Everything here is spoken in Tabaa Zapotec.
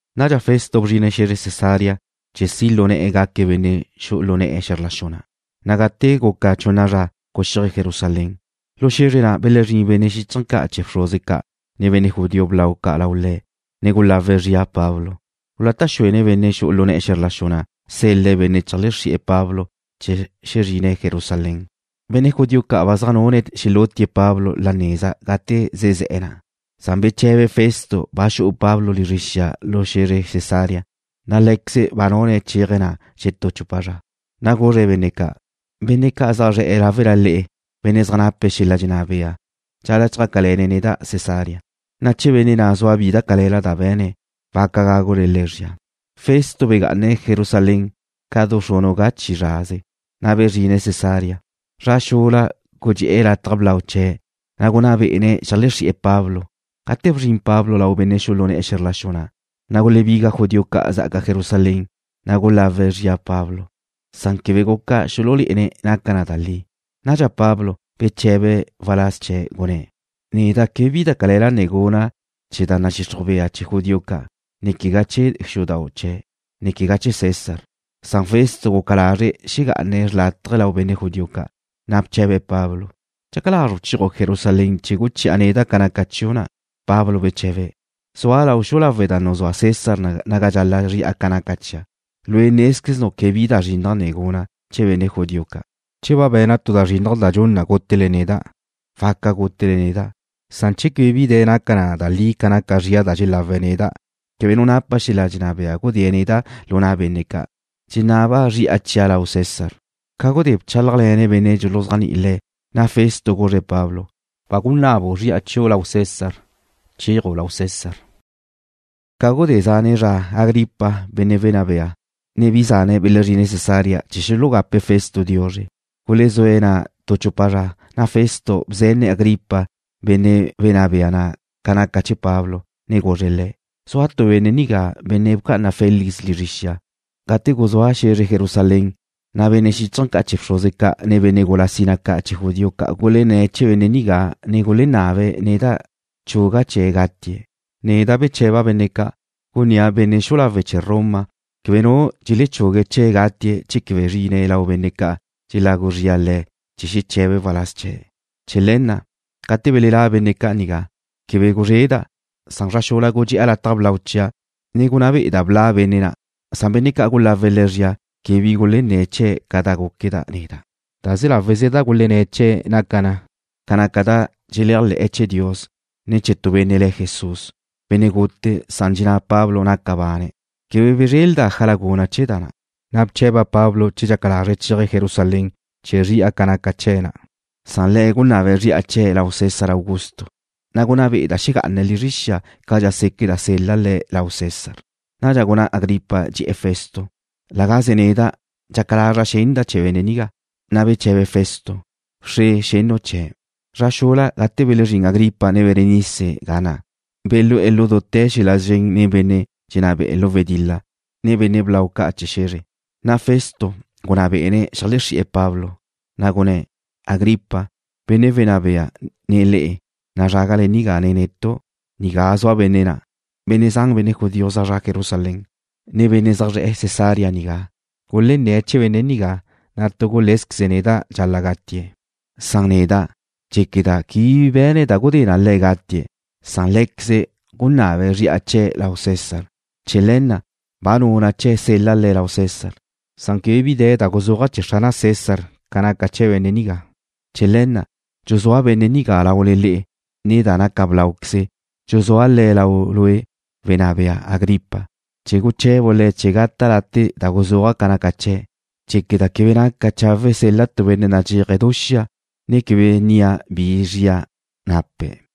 Nadxa Festo bzrine̱' xe̱zre Cesarea chee̱ si' lu ne̱'e̱ gaque̱' benne' xu'u lu ne̱'e̱ xe̱zr la xu na', na' gate guca chunna zra, guxíaje̱' Jerusalén. Lu xe̱zre na' belezrín benne' xíchaje̱ ca' chee̱ bxruze ca', ne benne' judío blau ca' lau le̱', ne gulawe̱' zria Pablo. Gulata' xuene̱' benne' xu'u lu ne̱'e̱ xe̱zr la xu na' sel-le̱' benne' cheajlexezri'e̱ Pablo chee̱ xezrine̱' Jerusalén. Benne' judío ca' ba zaj nune̱' xelútie̱' Pablo la neza gate zezé̱'e̱ na'. Beche̱be Festo ba xu'u Pablo lizre xia lu xe̱zre Cesarea, na' lé̱queze̱' ba nune̱' chéaje̱' na' xetú chupa zra. Na' guzre̱' benne' ca': ―Benne' ca' zaj zre̱'e̱ láwela le'e, benne' zaj nape̱' xel-la' dxenná bea, dxal-la' chjácale̱ne̱' neda' Cesarea, na' che benne' na' zua bi da cale̱la da be̱ne̱', waca gágule le̱' zria. Festo begá'ane̱' Jerusalén ca du xrunu' ga chi zraze, na' bezrine̱' Cesarea. Zra xula gudxé'e̱ lataj blau chee̱', ne gunná bé'ene̱' xeajlexrí'e̱ Pablo. Gate bzrin Pablo lau benne' xu'u lu ne̱'e̱ xe̱zr la xu na', na' gulebiga judío ca' zá'aca Jerusalén, ne gulágule̱'e̱ zria Pablo, san quebe guca xululé'ene̱' naca na da li. Nadxa Pablo beche̱be̱' waláz chee̱', gunné̱': ―Neda' quebe bi da cale̱la ne guna', quegá chee̱ da nadxixruj bea chee̱ judío ca', ne quegá chee̱ xudau' chee̱', ne quegá chee̱ César. Festo guca lazre̱' xegá'ane̱' xrlátaje lau benne' judío ca', na' bche̱be̱' Pablo: ―¿Dxaca lazru' chéaju' Jerusalén chee̱ guchi'a neda' ca naca chiu' na'? Pablo beche̱be̱': ―Zua' lau xu'u lawe' da nuzúa César naga dxal-la' zri'a ca naca chia'. Lue' nézqueznu' quebe bi da zrinnaj ne guna' chee̱ benne' judío ca'. Che ba be̱na' tu da zrinnaj da dxun na gútele neda', waca gútele neda'. Che quebe bi de̱ naca na da li ca naca zria da dxelawe̱' neda', quebe nu napa xel-la' dxenná bea gudée̱' neda' lu na' benne' ca'. Dxenaba' zri'a chia' lau César. Ca gudé bchálajle̱ne̱' benne' dxuluzéajni'i le̱', na' Festo guzre̱' Pablo: ―Ba gunabu' zri'a chiu' lau César. Chéaju' lau César. Ca gudé zane' zra Agripa, benne' wenná bea, ne bi zane̱' belezrine̱' Cesarea chee̱ xulugape̱' Festo diuzre. Gulezúe̱' na' tu chupa zra, na' Festo bzenne̱' Agripa, benne' wenná bea na' ca naca chee̱ Pablo. Guzre̱' le̱': ―Zua tu benne' nigá, benne' bca'ana Félix lizre xia. Gate guzúa' xe̱zre Jerusalén, na' benne' xíchaje̱ ca' chee̱ bxruze ca', ne benne' gula sina ca' chee̱ judío ca' gulenné̱' chee̱ benne' nigá, ne gulenabe̱' neda' chuga' chee̱' gatie̱'. Neda' beche̱ba' benne' ca', gunnía' benne' xu'u lawe' chee̱ Roma quebe nu benne' dxelechugue̱' chee̱' gatie̱' che quebe zrine̱' lau benne' ca' dxelawe' le̱' zria chee̱ xeche̱be̱' waláz chee̱'. Chee̱ le̱ na', gate belelá' benne' ca' nigá, quebe guzreda', na' zra xula gudxe'a lataj blau chia', ne gunná be'eda' bla' benne' na'. Benne' ca' gulawe̱' le̱' zria quebe bi gulenné̱' chee̱' ca da gúqueda' neda'. Laze láweze da gulenné̱' chee̱' naca na ca naca da dxeléajle̱'e̱ chee̱ Dios, ne chee̱ tu benne' le̱' Jesús, benne' gute, san dxenná Pablo naca bane̱'. Quebe bezréleda' ájala guna' chee̱ da na', na' bche̱ba' Pablo che dxaca lazre̱' chéaje̱' Jerusalén chee̱ zri'a ca naca chee̱' na'. Nadxa le̱' gunabe̱' zri'a chee̱' lau César Augusto, na' gunná be'eda' xegá'ane̱' lizre xia cadxa séqueda' sel-la' le̱' lau César. Nadxa gunná Agripa, dxe̱'e̱ Festo: ―La gaze neda' dxaca lazra' xenda' chee̱ benne' nigá. Na' beche̱be Festo: ―Wxre xennu' chee̱'. Zra xula, gate belezrín Agripa, ne Berenice ga na', belú'e̱ lu dute̱ xel-la' szren nen benne' dxenná be'e̱ lu wedil-la, ne benne' blau ca' chee̱ xe̱zre. Na' Festo gunná bé'ene̱' xeajlexrí'e̱ Pablo, na' gunné̱': ―Agripa, benne' wenná bea, ne le'e, nazrágale nigá nen netu'. Nigá zua benne' na'. Benne' zan, benne' judío zaj zre̱'e̱ Jerusalén, ne benne' zaj zre̱'e̱ Cesarea nigá, gulenné̱' chee̱ benne' nigá, na' tu gulé̱zqueze̱' neda' dxal-la' gatie̱'. Neda' dxéqueda' quebe bi be̱ne̱' da gudé na le̱' gatie̱', san lé̱queze̱' gunabe̱' zri'a chee̱' lau César. Chee̱ le̱ na' ba nuna' chee̱' sel-la' le̱' lau César. Quebe bi de̱ da guzúaja' chee̱ Xrana' César ca naca chee̱ benne' nigá. Chee̱ le̱ na' dxuzúa' benne' nigá laule le'e, ne da naca bláuqueze, dxuzúa' le̱' lau lue', wenná bea Agripa, chee̱ guche̱bu' le̱' chee̱ gata' late' da guzúaja' ca naca chee̱'. Dxéqueda' quebe naca chawe' sel-la' tu benne' nadxéaje̱' du xia, ne quebe nnia' bi da zria nape̱'.